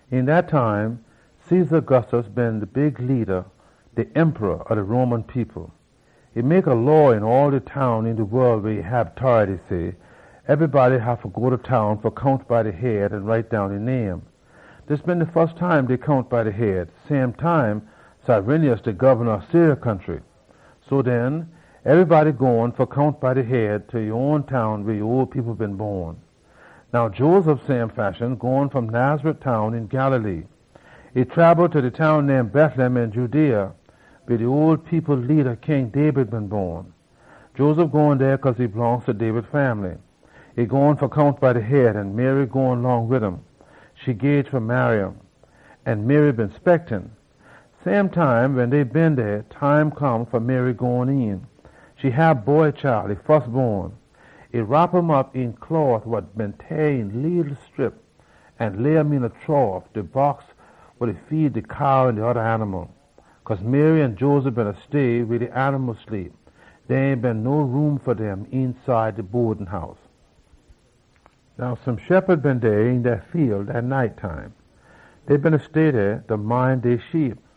Een dat time, Caesar Augustus been de rula ob de Roman people. E mek a law een all de town een de wol weh e hab tority, say, “Ebrybody haffa go ta town fa count by de head an write down e name.” Dis been de fus time dey count by de head, jurin de time Quirinius de gobna ob Syria country. So den, ebrybody gone fa count by de head, ta e own town weh e ole people been bon. Now Joseph same fashion gone fom Nazareth town een Galilee. E trabel ta de town name Betlem een Judea, weh de ole people leada, King David, been bon. Joseph gone dey cause e blongst ta David fambly. E gone fa count by de head, an Mary gone long wid um. E gage fa marry um. An Mary been speckin. Same time wen dey been dey, time come fa Mary gone een. E hab boy chile, e fusbon. E wrop um op een closs wa been teah eenta scrip an lay um een a trough weh dey feed de cow an oda animal dem. Cause Mary an Joseph beena stay weh de animal sleep. Dey ain been no room fa dem eenside de bodin house. Now some shephud been dey een de fiel dat night. Dey beena stay dey, da mind dey sheep.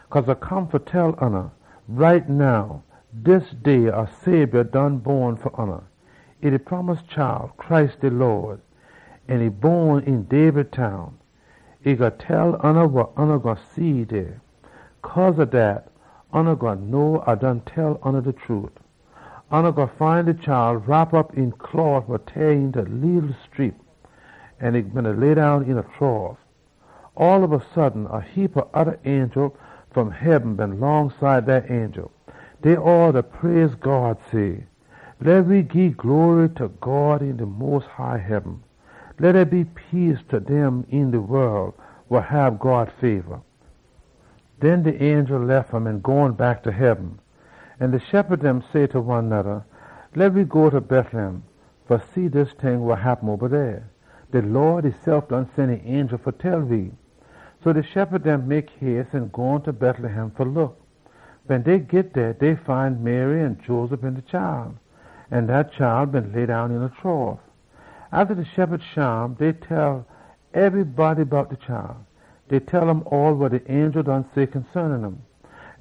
Cause A come fa tell oona, ‘Right now, dis day, a Sabior done bon fa oona. E Christ de Lawd. An e bon een David town!’ A gwine tell oona wa oona gwine see dey. Cause ob dat, oona gwine know A done tell oona de trute. Oona gwine find de chile wrop op een closs wa been teah eenta scrip, an e been leddown een a trough.” All ob a sudden, a heapa oda angel fom heaben been longside dat angel. Dey all da praise God, say, “Leh we gii glory ta God een de mos high heaben. Leh dey be peace ta dem een de wol wa hab God fabor!” Den de angel lef um an gone back ta heaben. An de shephud dem say ta one noda, “Leh we go ta Betlem fa see dis ting wa happen oba dey. De Lawd esef done sen e angel fa tell we.” So de shephud dem mek hace an gone ta Betlem fa look. Wen dey git dey, dey find Mary an Joseph an de chile. An dat chile been leddown een a trough. Atta de shephud shim, dey done tell ebrybody bout de chile. Dey tell um all wa de angel done say consaanin um.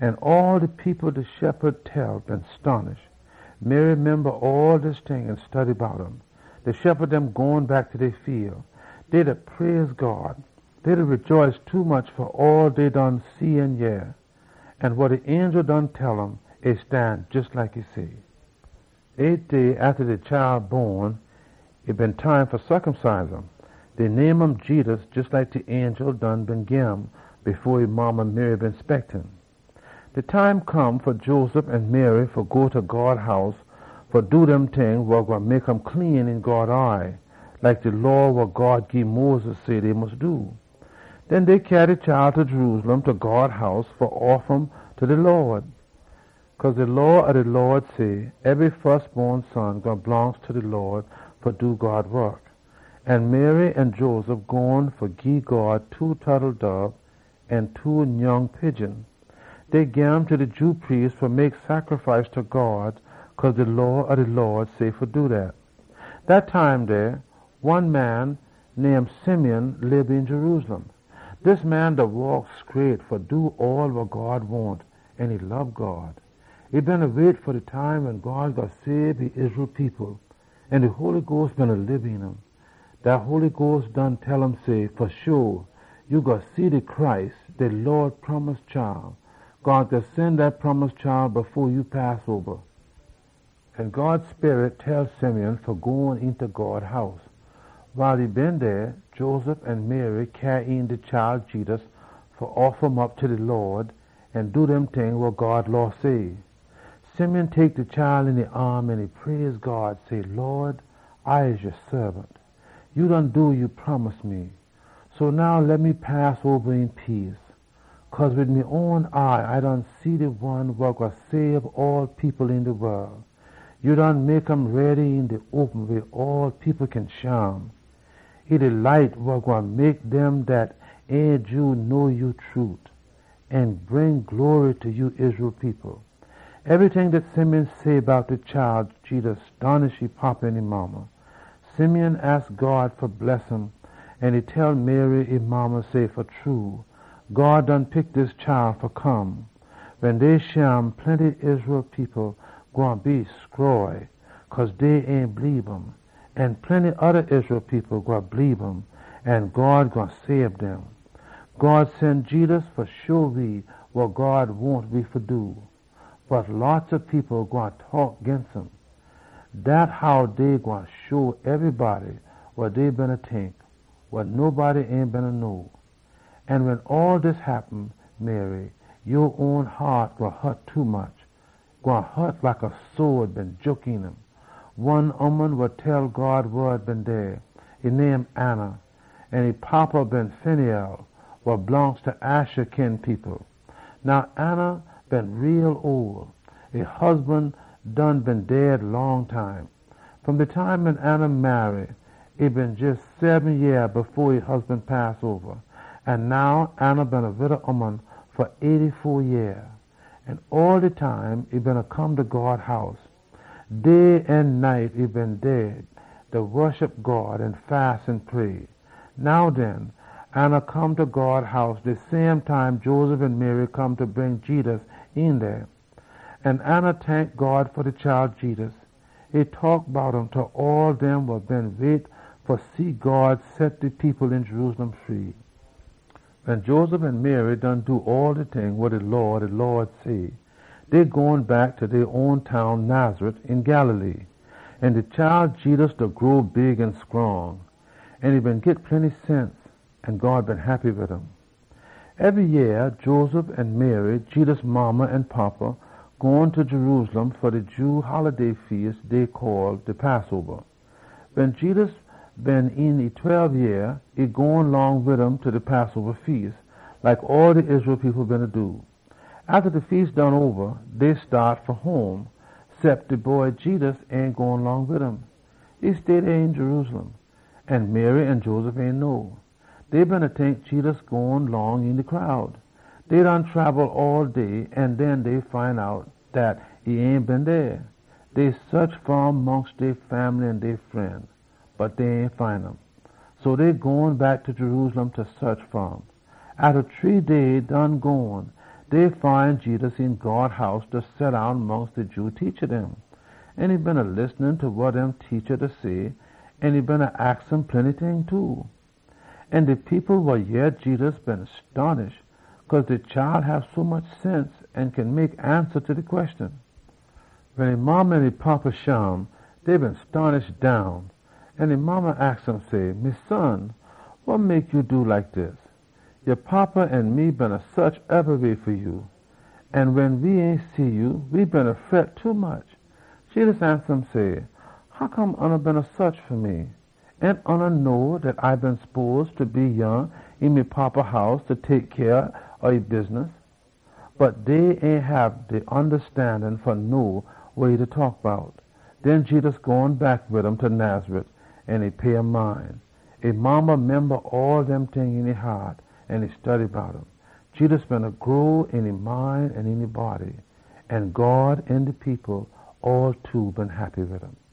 An all de people wa de shephud dem tell been stonish. Mary memba all dis ting an study bout um. De shephud dem gone back ta dey fiel. Dey da praise God. Dey da rejaice tommuch fa all dey done see an yeh. All wa de angel done tell um, e stan jes like e say. Eight day atta de chile bon, e been time fa circumcise um. Dey name um Jedus, jes like de angel done been gim fo e modda Mary been speckin. De time come fa Joseph an Mary fa go ta God House fa do dem ting wa gwine mek um clean een God eye, like de Law wa God gii Moses say dey mus do. Den dey cyaa de chile ta Jerusalem ta God House fa offa um ta de Lawd. Cause de Law ob de Lawd say, “Ebry fusbon son gwine blongst ta de Lawd fa do God wok.” An Joseph an Mary gone too fa gii God two tottledob or two nyoung pigeon. Dey gim ta de Jew priest fa mek sacrifice ta God cause de Law ob de Lawd say fa do dat. Dat time dey, one man name Simeon lib een Jerusalem. Dis man beena waak scraight fa do all wa God wahn, an e lob God. E beena wait fa de time wen God gwine sabe de Israel people. An de Holy Sperit beena lib een um. Dat Holy Sperit done tell um say, “Fa sho, ya gwine see de Messiah. God gwine sen um fo ya pass oba.” An God Sperit tell Simeon fa go eenta God House. Wiles e been dey, Joseph an Mary cyaa een de chile Jedus fa offa um op ta de Lawd an do dem ting wa God Law say. Simeon tek de chile een e aam, an e praise God say, “Lawd, A ya saabant. Ya done do wa ya promise me. So now leh me pass oba een peace. Cause wid me own eye A done see de one wa gwine sabe all people een de wol. Ya done mek um ready een de open weh all people kin shim. E de light wa gwine mek dem dat ain Jew know ya trute, an bring glory ta ya Israel people.” Ebryting dat Simeon say bout de chile Jedus stonish e fada an modda. Simeon aks God fa bless um, an e tell Mary, e modda, say, “Fa true, God done pick dis chile fa come. Wen dey shim, plenty Israel people gwine be stroy cause dey ain bleebe um. An plenty oda Israel people gwine bleebe um, an God gwine sabe dem. God sen Jedus fa sho we wa God wahn we fa do. Bot a heapa people gwine taak ginst um. Dat how dey gwine show ebrybody wa dey beena tink, wa nobody ain been know. An wen all dis happen, Mary, ya own haat gwine hut tommuch, gwine hut like a sode been jook een um.” One prophet ooman been dey. E name Anna, an e fada been Phanuel wa blongst ta Asher kin people. Now Anna been a ole ooman. E husban done been dead long time. Fom de time wen Anna marry, e been jes seben yeah fo e husban pass oba. An now Anna been a wida ooman eighty-fo yeah ole. All de time e beena come ta God House. Day an night e been dey dey, da woshup God an fast an pray. Now den, Anna come ta God House de same time Joseph an Mary come da bring Jedus een dey. An Anna tank God fa de chile Jedus. E taak bout um ta all dem wa beena wait fa see God set de people een Jerusalem free. Wen Joseph an Mary done do all de ting wa de Law ob de Lawd say, dey gone back ta dey own town, Nazareth, een Galilee. An de chile Jedus da grow big an scrong. An e been git plenty sense. An God been heppy wid um. Ebry yeah Joseph an Mary, Jedus fada an modda, gone ta Jerusalem fa de Jew holiday feas dey call de Passoba. Wen Jedus been een e tweb yeah, e gone long wid um ta de Passoba feas, like all de Israel people beena do. Atta de feas done oba, dey staat fa home, cep de boy Jedus ain gone long wid um. E stay dey een Jerusalem. An Mary an Joseph ain know. Dey beena tink Jedus gone long een de crowd. Dey done trabel all day, an den dey find out dat e ain been dey. Dey saach fa um mongst dey fambly an dey fren. Bot dey ain find um. So dey gone back ta Jerusalem fa saach fa um. Atta shree day done gone, dey find Jedus een God House, da seddown mongst de Jew teacha dem. An e beena listen ta wa dem teacha say, an e beena aks um plenty ting too. All de people wa yeh Jedus been stonish cause de chile hab sommuch sense an mek ansa ta de queshon. Wen e modda an e fada shim, dey been stonish down. An e modda aks um say, “Me son, wa mek ya do we like dis? Ya fada an me beena saach ebryweh fa ya. An wen we ain see ya, we beena fret tommuch.” Jedus ansa um say, “Hoccome oona beena saach fa me? Ain oona know dat A been spose fa be yah een me Fada house fa tek cyah ob e bidness?” Bot dey ain hab de ondastandin fa know wa e da taak bout. Den Jedus gone back wid um ta Nazareth, an e pay um mind. E modda memba all dem ting een e haat, an e study bout um. Jedus beena grow een e mind an een e body. An God an de people been heppy wid um.